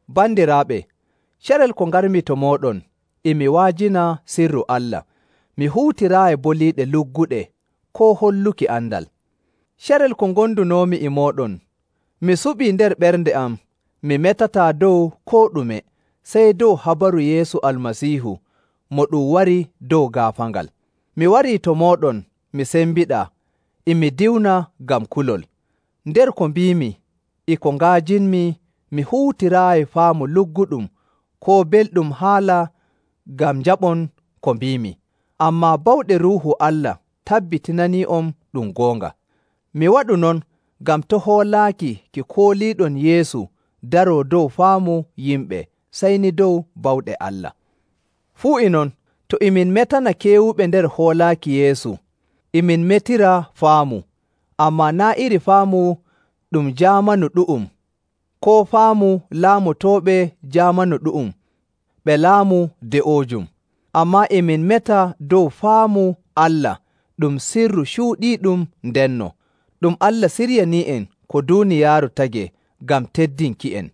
Bandiraaɓe, carel ko ngarmi to mooɗon e mi wa'ajina sirru Allah, mi huutiraayi boliiɗe lugguɗe koo holluki andal. Carel ko ngondunoomi e mooɗon, mi suɓii nder ɓernde am mi metataa dow koo ɗume, sey dow habaru Yeesu Almasiihu mo ɗum wari dow gaafaangal. Mi warii to mooɗon mi sembiɗaa, e mi diwna ngam kulol. Nder ko mbiimi e ko nga'ajinmi mi huutiraayi faamu lugguɗum koo belɗum haala ngam njaɓon ko mbiimi, ammaa bawɗe Ruuhu Allah tabbitinanii'on ɗum goonga. Mi waɗu non ngam to' hoolaaki ki kooliiɗon Yeesu daroo dow faamu yimɓe, sey ni dow bawɗe Allah. Fuu e non, to e min metana keewuɓe nder hoolaaki Yeesu, e min metira faamu, ammaa naa' iri faamu ɗum jaamanu ɗu'um, koo faamu laamotooɓe jaamanu ɗu'um ɓe laamu de'oojum. Ammaa e min meta dow faamu Allah ɗum sirru cuuɗiiɗum ndenno, ɗum Allah siryanii'en ko duuniyaaru tagee ngam teddinki'en.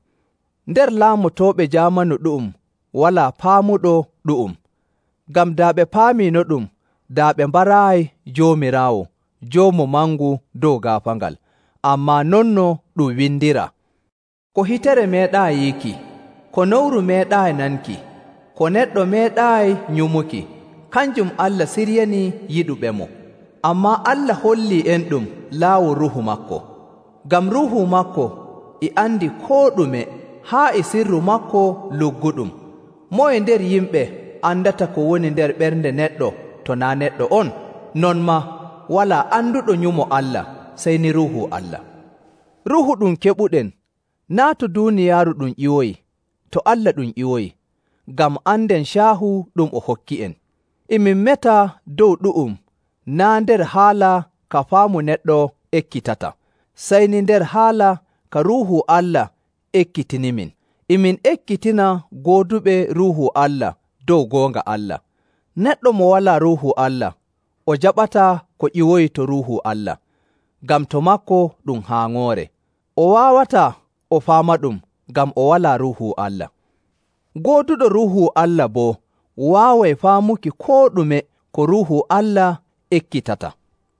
Nder laamotooɓe jaamanu ɗu'um walaa paamuɗo ɗu'um. Ngam daa ɓe paamiinoɗum, daa ɓe mbaraayi Joomiraawo joomu mangu dow gaafaangal. Ammaa non no ɗum windiraa, “Ko hitere meeɗaayi yiiki, ko nowru meeɗaayi nanki, ko neɗɗo meeɗaayi nyumuki, kanjum Allah siryanii yiɗuɓemo.” Ammaa Allah hollii'enɗum laawol Ruuhu maako. Ngam Ruuhu maako e andi koo ɗume haa e sirru maako lugguɗum. Moye nder yimɓe andata ko woni nder ɓernde neɗɗo to naa' neɗɗo on? Non maa, walaa anduɗo nyumo Allah sey ni Ruuhu Allah. Ruuhu ɗum keɓuɗen, naa' to duuniyaaru ɗum ƴiwoyi; to Allah ɗum ƴiwoyi, ngam anden caahu ɗum o hokki'en. E min meta dow ɗu'um naa' nder haala ka faamu neɗɗo ekkitata, sey ni nder haala ka Ruuhu Allah ekkitinimin. E min ekkitina gooduɓe Ruuhu Allah dow goonga Allah. Neɗɗo mo walaa Ruuhu Allah, o jaɓataa ko ƴiwoyi to Ruuhu Allah, ngam to maako ɗum haaŋoore. O waawataa o faamaɗum ngam o walaa Ruuhu Allah. Gooduɗo Ruuhu Allah boo waaway faamuki koo ɗume ko Ruuhu Allah ekkitata.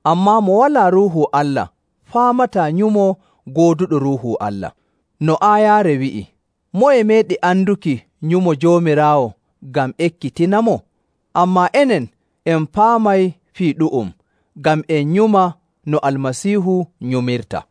Ammaa mo walaa Ruuhu Allah faamataa nyumo gooduɗo Ruuhu Allah. No aayaare wi'i, “Moye meeɗi anduki nyumo Joomiraawo ngam ekkitinamo?” Ammaa enen en paamay fii ɗu'um ngam en nyuma no Almasiihu nyumirta.